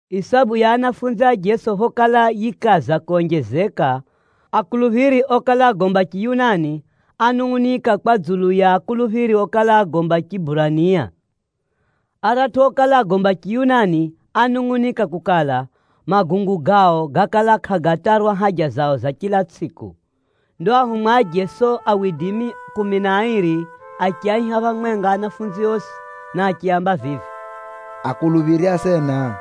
Isabu ya anafunzi a Jeso phokala yikaza konjezeka, akuluphiri okala agomba Chiyunani, ánungʼunika kwa dzulu ya akuluphiri okala agomba Chiburania. Aratʼu okala agomba Chiyunani ánungʼunika kukala, magungu gao gákala kʼagatarwa haja zao za chila tsʼiku. Ndo ao ahumwa a Jeso kumi na airi achiaiha phamwenga anafunzi osi, na achiaamba vivi, “Akuluphiri asena,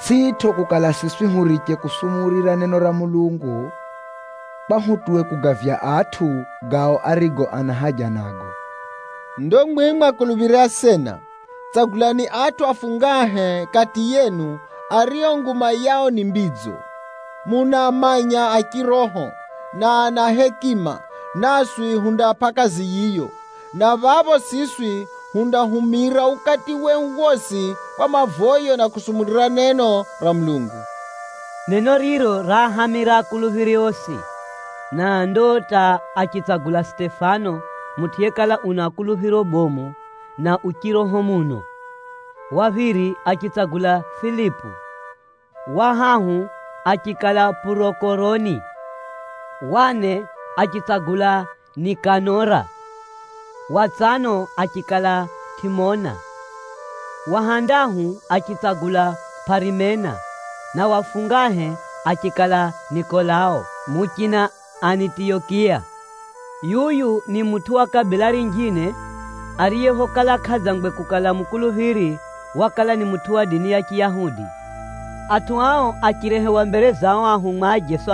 tsʼitʼo kukala siswi huriche kusumurira neno ra Mulungu, kwa hutuwe wa kugavya atʼu, gao arigo ana haja nago. Ndo mwimwi akuluphiri asena, tsagulani atʼu afungahe kati yenu, ario nguma yao ni mbidzo, munaamanya a chiroho, na ana hekima, naswi hundaapʼa kazi yiyo, na phapho siswi hundahumira ukati wehu wosi kwa mavoyo na kusumurira neno ra Mulungu.” Neno riro raahamira akuluphiri osi, na ndo hata achitsagula Sitefano, mutʼu yekala una kuluphiro bomu na u chiroho muno. Wa phiri achitsagula Filipu, wa hahu achikala Pʼurokoroni, wa ne achitsagula Nikanora, wa tsano achikala Tʼimona. Wa handahu achitsagula Pʼarimena, na wa fungahe achikala Nikolao muchina Anitiyokiya. Yuyu ni mutʼu wa kabila rinjine, ariye phokala kʼadzangwe kukala mukuluphiri, wakala ni mutʼu wa dini ya Chiyahudi. Atʼu ao achirehewa mbere za o ahumwa a Jeso,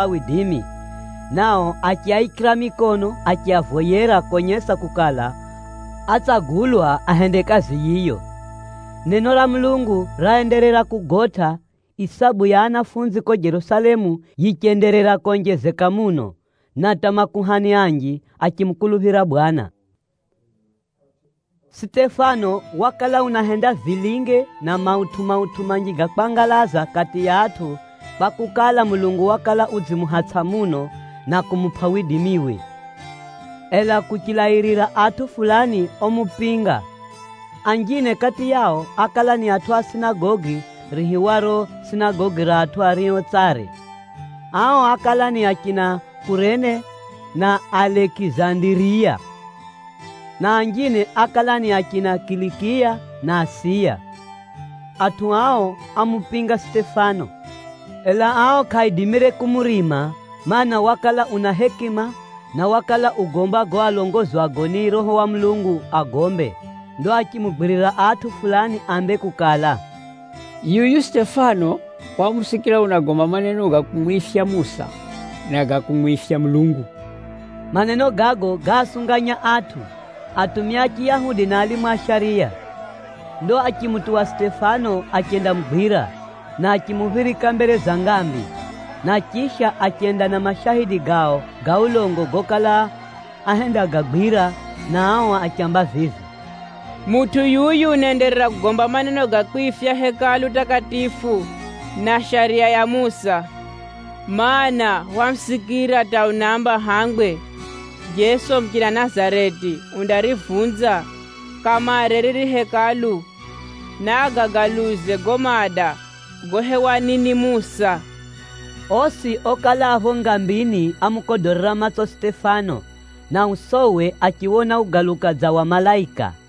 nao achiaikira mikono achiavoyera konyesa kukala, atsagulwa ahende kazi yiyo. Neno ra Mulungu raenderera kugotʼa, isabu ya anafunzi ko Jerusalemu yichenderera konjezeka muno, na hata makuhani anji achimukuluphira Bwana. Sitefano wakala unahenda vilinge na mautʼu-mautʼu manji ga kwangalaza kati ya atʼu, kwakukala, Mulungu wakala udzimuhatsʼa muno, na kumupʼa widimiwe. Ela kuchilairira atʼu fulani omupinga. Anjine kati yao ákala ni atʼu a sinagogi riihiwaro “Sinagogi ra atʼu ario tsare.” Ao ákala ni achina Kurene na Alekizandiriya, na anjine ákala ni achina Kilikiya na Asiya. Atʼu ao ámupinga Sitefano, ela ao kʼaaidimire kumurima, mana, wakala una hekima, na wakala ugomba gago alongozwago ni Roho wa Mulungu agombe. Ndo achimugwirira atʼu fulani ambe kukala, “Yuyu Sitefano hwamusikira unagomba maneno ga kumwifya Musa, na ga kumwifya Mulungu!” Maneno gago gáasunganya atʼu, atumia a Chiyahudi na alimu a shariya. Ndo achimutuwa Sitefano achendamugwira, na achimuphirika mbere za ngambi. Na chisha, achenda na mashaidi gao ga ulongo gokala ahendagagwira, na ao achiamba vivi, “Mutʼu yuyu unaenderera kugomba maneno ga kwifya Hekalu takatifu, na Shariya ya Musa. Maana, hwamusikira hata unaamba hangwe, Jeso muchina Nazareti undarivunza kamare riri Hekalu, na agagaluze gago maada gohewani ni Musa.” Osi okala a pho ngambini ámukodorera matso Sitefano, na usowe achiwona ugaluka dza wa malaika.